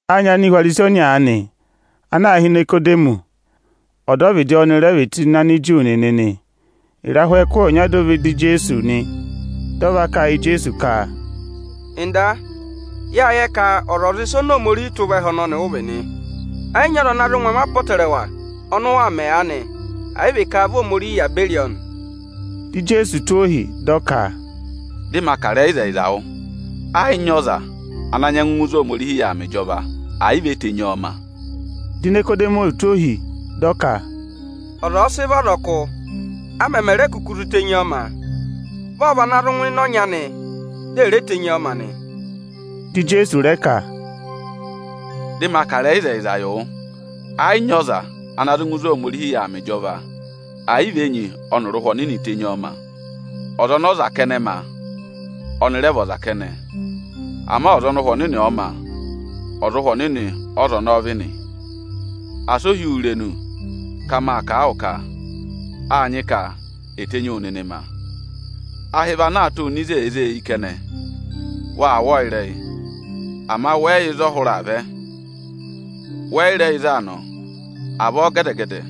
Â nyị Anihwarisi ọnya aanị, ana aā hị́ Inikodemọsị. Ọdọvịdị Aniju nịnị nị ọ́nị rẹ vị. Ịrahụ ẹkụhị ọnya dị ọ vẹ ịdị Ijeesu nị. Dị ọ va kà a yị Ijeesu ka, “Ọga, yâ yẹ ka ọzwọzịsa oni Ohomorihi tụ́ vẹ ẹhẹ ọnọnị ụ vị nị. Ẹ yị nyị ọza ịnya ana zụ mẹ ẹngụ apọtẹrẹwa ọnị ụ waa mẹ aanị, ẹ̀ yị vị ka vị Ohomorihi yà beri ọ nị.” Dị Ijeesu tụ́ ọ ohi, dị ọ ka, “Dị ma kà ịrẹyị ịzẹyịza wụ: ẹ yị nyị ọza ana nyẹngụ ngụ ịzị Ohomorihi yà aa mẹ ịjọva, ẹ̀ yị vị e tenyi ọọ ma.” Di Inikodemọsị tụ́ ohi, dị ọ ka, “Ọza ọ̀ọ sị vị ọzọkụ, a mẹmẹ re kuku zụ tenyi ọọ ma? Vị ọ́ọ́ vị ana zụ ngụ ịnị ịnẹ ọnyị anị, di è re tenyi ọ ma nị?” Dị Ijeesu rẹ ka, “Dị ma kà ịrẹyị ịzẹyịza yị wụ, ẹ yị nyị ọza ana zụ ngụ ịzị Ohomorihi yà aa mẹ ịjọva, ẹ̀ yị vị a sị enyi ọnịrị Ụhwẹ Ọnịnị tenyi ọọ ma. Ọza ọnị ọza kẹnẹ ma, rẹ vị ọza kẹnẹ; ama ọza ọnị Ụhwẹ Ọnịnị ọ̀ọ ma, ọza Ụhwẹ Ọnịnị ọ́za ọnọọ vị nị. Asị o hí wu irenu ka mâ kà a wụ ka: ‘Â nyị ka è tenyi wu nịnị ma’! Ahị vị ana aa tụ́ nọ ịzị èe zé e eyi kẹnẹ. Waa wụ́ ọọ ịrẹyị, ama wẹ yị yẹ ịzị ọ hụrẹ aa vẹ, wẹ yị rẹ yẹ ịzị aa nọ. Avọọ gẹdẹ-gẹdẹ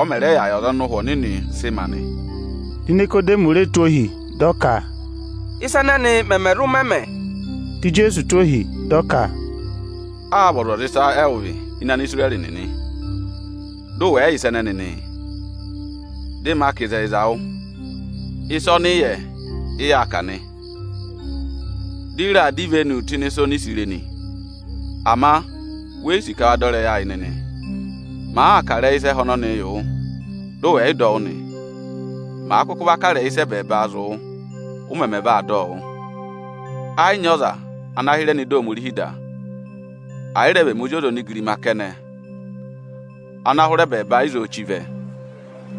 ọ mẹ̀ rẹ yà yị ọza ọnị Ụhwẹ Ọnịnị sị ma nị.” Di Inikodemọsị re tụ́ ohi, dị ọ ka, “Ị́sa ẹnẹnị mẹmẹ zụ mẹ mẹ?” Di Ijeesu tụ́ o ohi, dị ọ ka, “Áa vị ọzwọzịsa ẹwụ vị ini Anisirẹrị nịnị, dị ụ wẹ̀ yị yẹ ịsa ẹnẹnị nịị? Dị ma kà ịzẹyịza wụ, ịsa ọnị ị yẹ, ị yaa kà nị, dị ị raa dọ ivenu tụ́ ịnị ịsa oni i si re nị. Ama we yi sì ka wa dọ ịrẹyị ayị nịnị. Màaa kà ịrẹyị ịsa ẹhẹ ọnọnịị yị wụ, dị ụ wẹ̀ yị dọ wụ́ nị; màa kụkụ va kà ịrẹyị ịsa ẹbẹẹba zụ̀ wụ, ụ mẹmẹ vaa dọ ọ wụ́? Ẹẹ̀ yị nyị ọza ana hịrẹ nọ ịdị Ohomorihi da, ẹ̀ yị rẹ vị ẹmị Ozi ọza onigirima kẹnẹ ana hụrẹ ẹbẹẹba ịzọọ chí vẹ.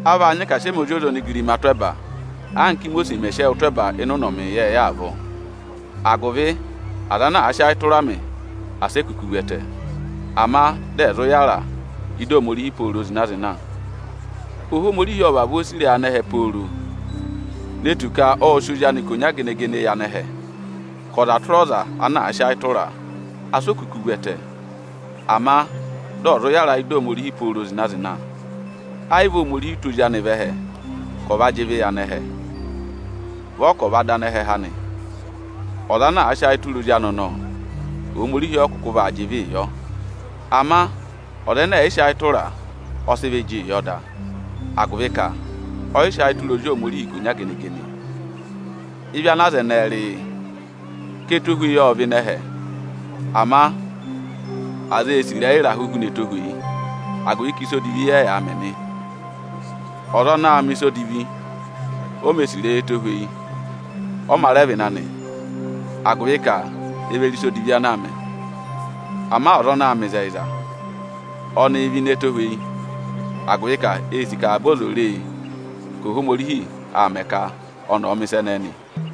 A vaa nyị ka à sị ẹmị Ozi ọza onigirimaa tụ́ ẹba, anka Ímosiisi mẹ̀ sị ẹwụ tụ́ ẹba ịnị ụnọmị ịyẹẹyẹ avọọ, agụvị aza ana àa sị ayị tụra mị, asị e kuku vu ẹtẹ, ama dị ẹ̀ zụ yára ị́dị Ohomorihi pooro zịna-zịna.” Ohomorihi ộ vavọọ sì ịrẹyị anẹhẹ pooro, ne tù ka ộ sị Ozi anị ikonya gene-gene yị anẹhẹ; ka ọza tụra ọza ana àa sị ayị tụra a, asị o kuku vu ẹtẹ, ama dị ọ̀ zụ yára ị́da Ohomorihi pooro zịna-zịna. Ẹ yị vị Ohomorihi tụ́ Ozi anị vẹ ẹhẹ ka ọ̀ va jị ịvị yị anẹhẹ. Vị ọ ka ọ̀ va dọ anẹhẹ há nị. Ọza ana àa sị ayị tụra Ozi anị ọnọọ, Ohomorihi ọ yị kụkụ vaa jị ịvịị yọ; ama ọza ẹnẹ ẹ̀ yị sị ayị tụra a, ọ sị ịvị jịị yọ da, agụvị ka ọ yị sị ayị tụra Ozi Ohomorihi ikonya gene-gene. Ịvị ana aza ẹnẹẹ rị, yị: Ka ẹtohweyi ộ vẹ ịnị ẹhẹ, ama aza ê sì ịrẹyị ịrahụ huna ẹtohweyi, agụvị ka ịsa odivi ẹ́ yaa mẹ nị. Ọza anaā mẹ̀ ịsa odivi, o mē sì ịrẹyị ẹtohweyi, ọ mā rẹ vẹ ịnị anị, agụvị ka e ve re ịsa odivi ana aa mẹ. Ama ọza anaā mẹ ịzẹyịza, ọnịị̄ vẹ ini ẹtohweyi, agụvị ka ee sì ka avaba ọzọza ò re e ka Ohomorihi aa mẹ ka ọnị ọ̀ọ mẹ̀ ịsa ẹnẹẹ nị.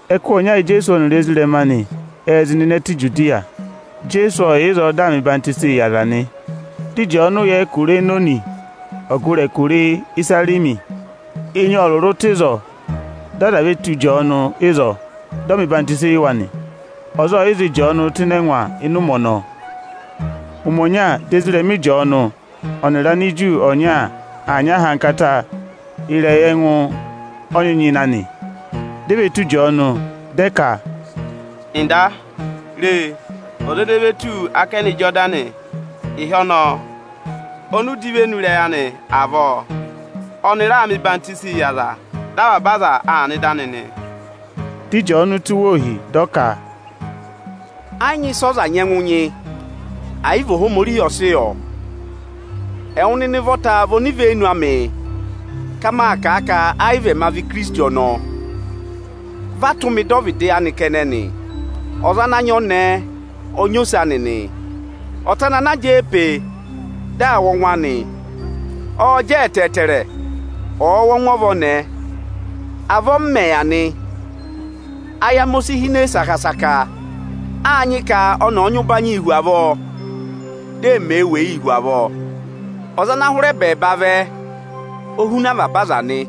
Ẹkụhị ọnya Ijeesu ọnịrị ezirẹma anị ệ zị nọ ịnị ẹtẹ Ijudiya. Ijeesu ộ yà ịzọọ dị aa mẹ ọyịhwenyii yị aza nị. Dị Ịjọọnụ yà ẹkụra ana aā hị́ Enoni, ọgụrị ịzị aā hị́ Isarimi nị. Enyi ộ rụrụ tụ́ ịzọọ, dị aza ve tù Ịjọọnụ ịzọọ, dị ọ mẹ̀ ọyịhwọzenyi yị wa nị. Ọza ọọ̀ yị za Ịjọọnụ tụ́ ịnị ẹngwa ịnị ụmẹ ọnọọ. Ụmẹ ọnya, dị ezirẹma Ịjọọnụ ọnịrị Aniju ọnya aa nyị ahankata ịrẹyị ẹngụ ọyịnyịna nị. Di e ve tù Ịjọọnụ, dị ẹ ka, “Ọga, re, ọza ene ve tù wu ákẹnẹ Ijodani ịhị ọnọọ ọnị ụ dọ ivenu ịrẹyị anị avọọ, ọnị raa mẹ ọyịhwenyii yị aza; dị avaba aza aa nọ ịdị anị nị.” Dị Ịjọọnụ tụ́ wa ohi, dị ọ ka, “Ẹ yị nyị ịsị ọza nyẹngụ nyị, ẹ̀ yị vị Ohomorihi ọ̀ọ sị yọ. Ẹwụ nịnị ụvọta vị onivenu amị ka mâ kà a ka ẹ yị vị ẹma vị Ikirisiti ọnọọ; vị a tụ́ mị dọ ọvịdị anị kẹnẹ nị. Ọza ana aa nyị ọnẹẹ, ọ nyị ose anị nị. Ọta anị ana jẹẹ pe e dị aa wụ́ ọngwẹ anị, ọọ̄ jẹ ẹtẹẹtẹrẹ, ọ̀ọ wụ́ ọngwẹ ọva ọnẹẹ. Avọọ m mẹ̀ yà nị, ayị amị o si hine saka-saka. Â nyị ka ọnị ọ̀ọ nyị ụbanyịị hu avọọ, dị ẹmị èe weyii hu avọọ.” Ijeesu ọ hụrẹ ẹbẹẹba vẹ ẹhẹ nị. “Ọza ana hụrẹ ẹbẹẹba vẹ, o huna avaba aza nị.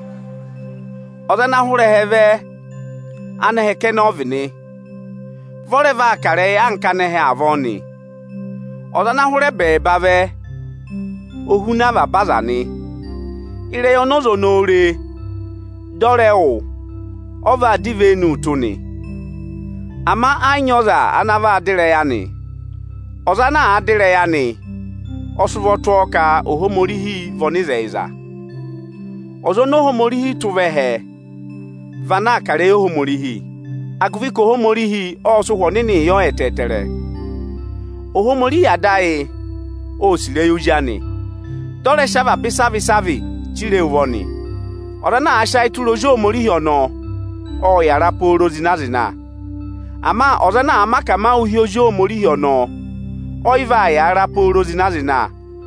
Ọza ana hụrẹ ẹhẹ vẹ, anẹhẹ kẹnẹ ọ vị nị; vị ọ rẹ vaa kà ịrẹyị anka anẹhẹ avọọ nị. Ọza ana hụrẹ ẹbẹẹva vẹ, o huna avaba aza nị. Ịrẹyị ọnị ọza ọnọọ re, dị ọ rẹ wụ́, ọ va dọ ivenu tụ́ nị, ama ẹ yị nyị ọza ana va dọ ịrẹyị anị. Ọza ana àa dọ ịrẹyị anị ộ sị ụvọ tụ́ ọọ ka Ohomorihi vị ọnịzẹyịza. Ọza oni Ohomorihi tụ́ vẹ ẹhẹ, vị ana aa kà ịrẹyị Ohomorihi, agụvị ka Ohomorihi ọ́ sị Ụhwẹ Ọnịnịị yọ ẹtẹẹtẹrẹ. Ohomorihi Ada ayị ô sì ịrẹyị Ozi anị, dị ọ rẹ sị avaba ịsavị-ịsavị chire e ụvọ nị. Ọza ana àa sị ayị tụra Ozi Ohomorihi ọnọọ, ộ yàra pooro zịna-zịna. Ama ọza ana àa mẹ akamawụ hi Ozi Ohomorihi ọnọọ, ọ yị vaa yàra pooro zịna-zịna.”